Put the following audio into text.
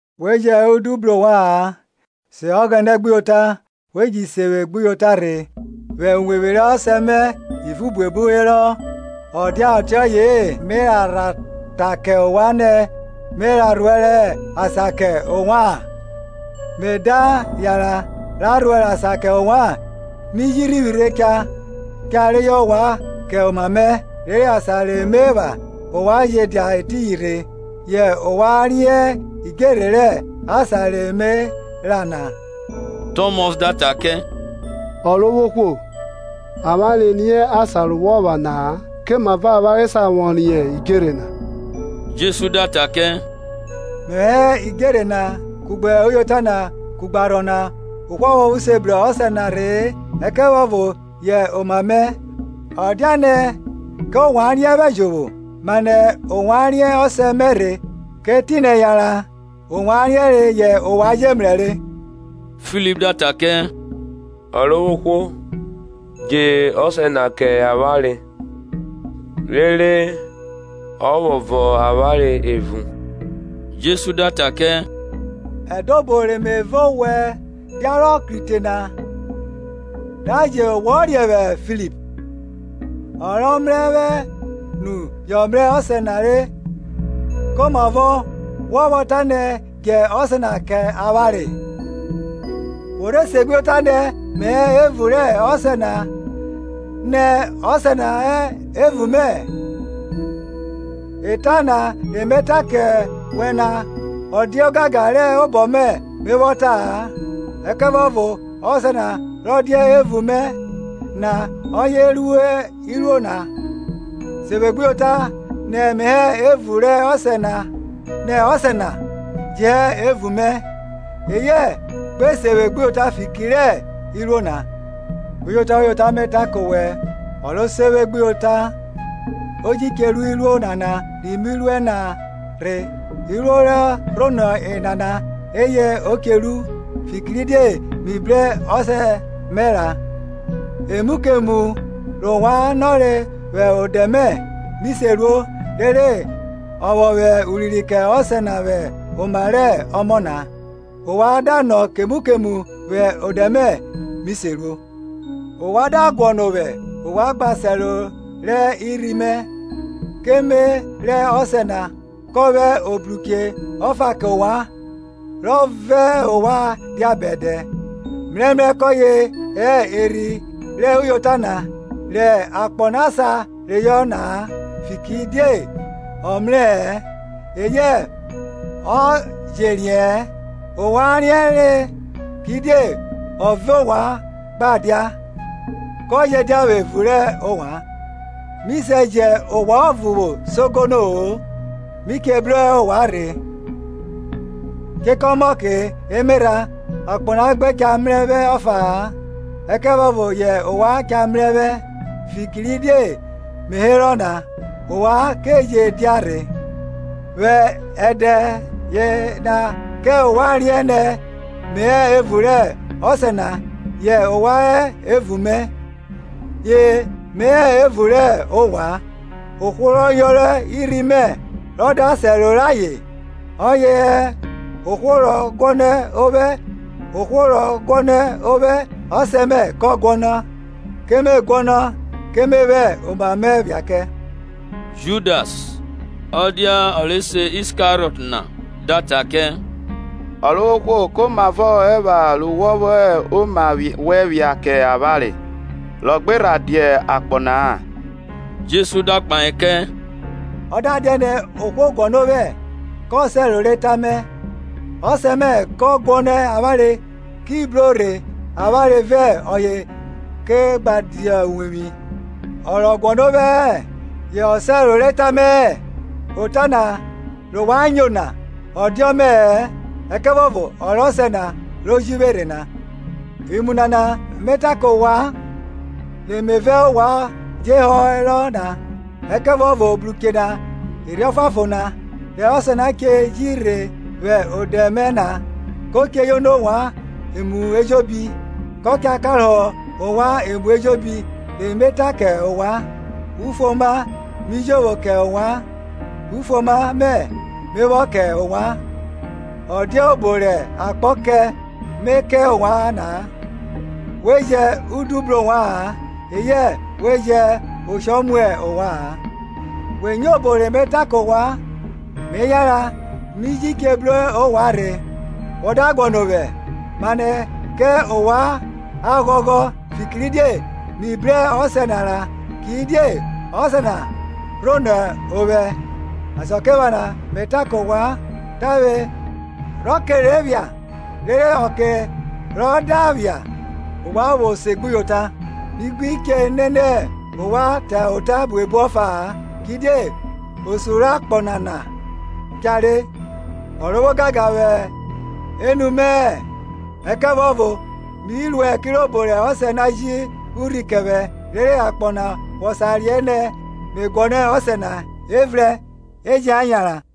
We jẹn udu bru ovwa-an; se Ọghẹnẹ gbuyota, we ji se vwẹ gbuyota rhe. Vwẹ uwevwi rẹ Ọsẹ mẹ ivun buebu herọ; ọ dia ọtiọye-e, me a rha ta kẹ ovwan nẹ me ra rhuẹrẹ asan kẹ ovwan? Me da yanran ra rhnẹrẹ asan kẹ ovwan, mi ji rhivwi cha cha reyọ ovwan kẹ oma mẹ, rere asan re me epha ovwan je dia etiyin rhe. Yẹ ovwan riẹn idjerhe rẹ asan re me ra na. Tọmọs da ta kẹ, Ọrovwohwo, avwanre riẹn asan re wọ ra na-a; komavọ avwanre sa vwọ riẹn idjerhe na? Jesu da ta kẹ, Mẹvwẹ hẹ idjerhe na, kugbe uyota na, kugbe arhọ na; ohwo ọvuọvo se bru Ọsẹ na rhe-e, ẹkẹvuọvo yẹ oma mẹ. Ọ diane kẹ ovwan riẹn vwẹ jovwo, mane yẹ ovwan riẹn Ọsẹ mẹ rhe; kẹ etinẹ yanran ovwan riẹnrẹ yẹ ovwan je mrẹ re. Filip da ta kẹ, Ọrovwohwo, dje Ọsẹ na kẹ avwanre, rere ọ vwọ vọn avwanre evun. Jesu da ta kẹ, Ede obo re me vẹ owẹ diarọ krite na, da je wọ riẹn vwẹ Filip? Ọ rọ mrẹ vwẹ nu jọ mrẹ Ọsẹ na re; Komavọ wọ vwọ tanẹ, Djẹ Ọsẹ na kẹ avwanre? Wo rhe segbuyota nẹ me hẹ evun rẹ Ọsẹ na nẹ Ọsẹ na hẹ evun mẹ? Eta na re me ta kẹ wẹ na ọ diẹ ogangan rẹ obọ mẹ me vwọ ta-a; ẹkẹvuọvo Ọsẹ na rọ dia evun mẹ na ọye ru iruo na. Se vwe gbuyota nẹ me hẹ evun rẹ Ọsẹ na nẹ Ọsẹ na je hẹ evun mẹ; eyẹ gbe se vwe gbuyota fiki rẹ iruo na. Uyota, uyota, me ta kẹ owẹ, ọ ro se vwe gbuyota o ji che ru iruo nana ri mi ruẹ na rhe; iruo re rhonọ enana eye o che ru, fikiridie mi bru Ọsẹ mẹ ra. Emu kemu rẹ ovwan nọre vwẹ odẹ mẹ, mi se ruo, rere a vwọ vwẹ urinrin kẹ Ọsẹ na vwẹ oma rẹ Ọmọ na. Ovwan da nọ kemu kemu vwẹ odẹ mẹ, mi se ruo. Ovwan da guọnọ ovwẹ, ovwan gba sẹro rẹ irhi mẹ. Ke me rẹ Ọsẹ na, kọ vwẹ Obruche ọfa kẹ ovwan, rọ vẹ ovwan gbe dia bẹdẹ, mrẹmrẹ kọye hẹ Erhi rẹ uyota na, rẹ akpọ na sa reyọ na-a, fikiridie ọ mrẹ rẹ-ẹ eyẹ ọ je riẹ-ẹn; ovwan riẹnrẹ kidie ọ vẹ ovwan gba dia, kọ je dia evun rẹ ovwan. Mi se jẹ ovwan ọvo vwo sogono-o; mi che bru ovwan rhe. Chekọ ọmọke emerha, akpọ na gbe cha mrẹ vwẹ ọfa-a, ẹkẹvuọvo yẹ ovwan cha mrẹ vwẹ; fikiridie me herọ na, ovwan ke je dia rhe. Vwẹ ẹdẹ yena kẹ ovwan riẹn nẹ me hẹ evun rẹ Ọsẹ na, yẹ ovwan hẹ evun mẹ, ye me hẹ evun rẹ ovwan. Ohwo rọ yọnrọn irhi mẹ rọ da sẹro rẹ ayen, oyẹ hẹ ohwo rọ guọnọ ovwẹ; ohwo rọ guọnọ ovwẹ Ọsẹ mẹ kọ guọnọ, ke me guọnọ ke me vwẹ oma mẹ phia kẹ. Judas, ọ dia ọ re se Iskariọt na-a! da ta kẹ, Ọrovwohwo, komavọ ọ epha ru wọ vwọ vwẹ oma wẹn phia kẹ avwanre, rọ gbe rha dia akpọ na-a? Jesu da kpahe kẹ, Ọ da dianẹ ohwo guọnọ ovwẹ, ko sẹro rẹ ota mẹ, Ọsẹ mẹ kọ guọnọ avwanre ki bro rhe avwanre vẹ ọye ke gba dia uwevwi. Ọ rọ guọnọ ovwẹ-ẹ yo sẹro rẹ eta mẹ-ẹ; ota na re ovwan nyo na ọ dia ọmẹ-ẹ ẹkẹvuọvo ọ rẹ Ọsẹ na ro ji vwe rhe na. Imu nana me ta ke ovwan, re me vẹ ovwan vwọ je herọ na. Ẹkẹvuọvo Obruche na, Erhi Ọfuanfon na, rẹ Ọsẹ na che ji rhe vwẹ odẹ mẹ na, ko chẹ yono ovwan emu ejobi, kọ cha karohọ ovwan emu ejobi re me ta kẹ ovwan. Ufuoma mi jovwo kẹ ovwan; ufuoma mẹ me vwọ kẹ ovwan; ọ dia obo rẹ akpọ kẹ me kẹ ovwan na-a. We jẹn udu bru ovwa-an, eyẹ we jẹn oshọ mu ovwa-an. Wẹ nyo obo re me ta kẹ ovwan, me yanran, mi ji che bru ovwan rhe. Wọ da guọnọ ovwẹ, mane kẹ ovwan a ghọghọ, fikiridie mi bru Ọsẹ na ra; kidiẹ Ọsẹ na rhonọ ovwẹ. Asakiephana me ta kẹ ovwan tavwe rọ ke rhe phia, rere ọke rọ da phia, ovwan vwo se gbuyota. Mi gbi che nene ovwan ta ota buebu ọfa-a, kidie osun rẹ akpọ nana cha re. O vwo ogangan vwẹ enu mẹ-ẹ. Mi ruẹ kirobo rẹ Ọsẹ na ji urhi kẹ vwẹ, rere akpọ na vwọ sa riẹn nẹ me guọnọ Ọsẹ na. Evrẹn, e jẹn a yanran.